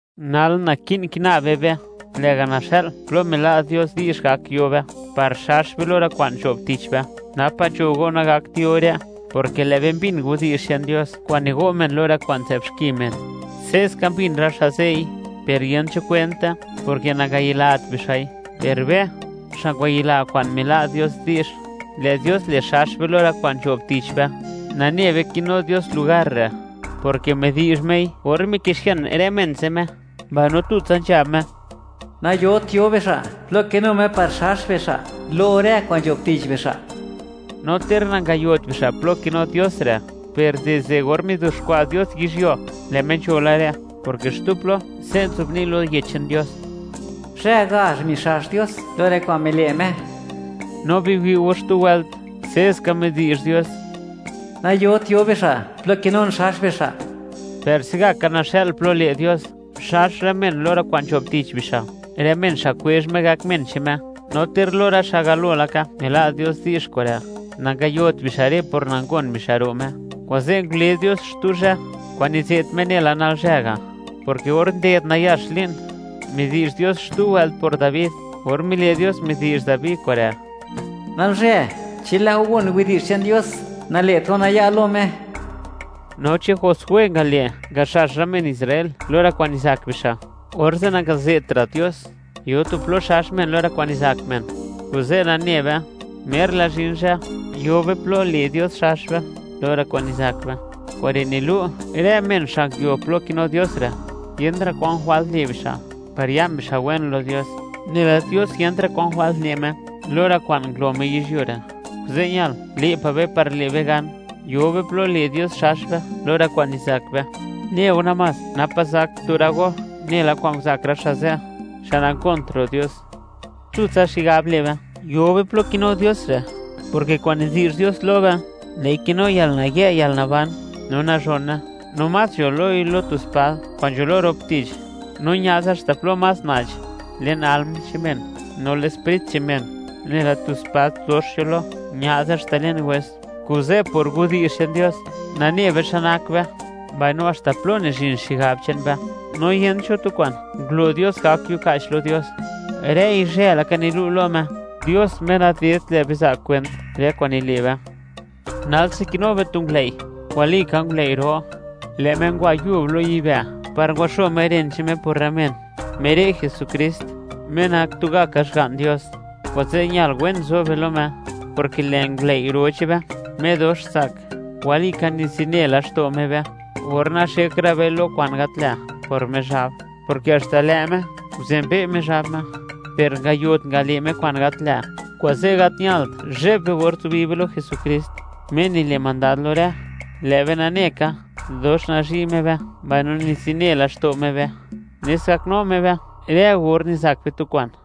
Nal, naki'n kina be be, lë'ga' naxa'l plo mila' Dios di'zh gak yo be par xax be lo rë kwa'n nzho'b tich be; napa' nzho go nagakt yo re', porke lë' be mbin widi'zh che'n Dios kwa'n nigo' men lo rë kwa'n nzë'b xki men; se'ska mbin rë xa' ze'i, per yent cho kwente, porke nangayilat bixa'i. Per be, xa' ngwayila kwa'n mila' Dios di'zh, lë' Dios le' xax be lo rë kwa'n nzho'b tich be. Nane be kinu Dios lugar re', porke midi'zh Mei or mikixian rë men ze' Me, mbaino tutsa nzhab Me, nayot yo bixa' plo kinu Me par xax bixa' lo rë kwa'n nzho'b tich bixa'. No ter nangayot bixa' plo kinu Dios re', per dizde or mizuxkwa' Dios yizhyuo, lë Me nzho la re', porke xtu plo se' nzobni' lo Yech che'n Dios: Zhë gazh mixax Dios lo rë kwa'n mile' Me. No biwi' go xtu wëlt, se'ska midi'zh Dios: Nayot yo bixa' plo kinun xax bixa'. Per se'gaka naxa'l plo le' Dios, xax rë men lo rë kwa'n nzho'b tich bixa', rë men xa' kwezh Me gak men che'n Me; no ter lo rë xa' galo laka mila' Dios di'zh kure', nangayot bixa' re' por nangon bixa' ro' Me. Kuze' ngule Dios xtu zhë kwa'n nize't Me nela “Nalzhë” ga', porke or nded nayax li'n, midi'zh Dios xtu wëlt por Dabi, or mile' Dios midi'zh Dabi kure': Nalzhë, chi lë' go gon widi'zh che'n Dios, nale't go naya' lo Me. No chi Josué ngale' ngaxax rë men Israel lo rë kwa'n nizak bixa', orze' nangaze'tra' Dios: “Yo tu plo xax men lo rë kwa'n nizak men.” Kuze' nane be, mer la zhin zhë yo be plo le' Dios xax be lo rë kwa'n nizak be. Kure' nilu', rë men xa' nguio plo kinu Dios re', yentra' kwan jwalt le' bixa' par ya'n bixa' wen lo Dios, nela Dios, yentra' kwa'n jwalt le' Me lo rë kwa'n ngulo Me yizhyuo re'. Kuze' ñal le' pa' be par le' be gan, yo be plo le' Dios xax be lo rë kwa'n nizak be, neu namás napa' zak tu rë go nela kwa'n nguzak rë xa' ze', xa' nangont ro' Dios. Tutsa xigab le' be yo be plo kinu Dios re', porke kwa'n nidi'zh Dios lo be, lë'i kinu yalnayë' yalnaban no nazhone, no más nzho loi lo tu spad kwa'n nzho lo rop tich; no ña'ze haxta plo más na'ch le'n alm che'n men, no le'n sprit che'n men, nela tu spad dox nzho lo ña'ze haxta le'n wes. Kuze', por widi'zh che'n Dios, nane be xa nak be, mbaino haxta plo nizhin xigab che'n be. No yent cho tu kwa'n ngulo Dios gak yuka'ch lo Dios; rëi zhë laka nilu' lo Me, Dios Me nadedt lë' be za' kwent rë kwa'n nile' be. Nalse kinu be tu ngulëi', walika ngulëi' ro; lë' Me ngwa yub lo yibë' par ngwaxo Me ren che'n Me por rë men; Me re' Jesukrist, Me nak tugaka Xga'n Dios; kuze' ñal wen zo be lo Me, porke lë' ngulëi' ro che'n be, Me dox tsak, walika nizine laxto' Me be or naxek ra' be lo kwa'n gat lë' por Mizhab, porke haxta lë' Me nguzenbe' Mizhab Me (miwi' Mizhab xmod nak Me), per nangayot ngale' Me kwa'n gat lë'. Kuze', gat ñalt zhe'b be or zubi be lo Jesukrist, Me nile' mandad lo rë. Lë' be nane ka, dox nazhi' Me be mbaino nizine laxto' Me be, nes gaknu Me be rë or nizak be tu kwa'n.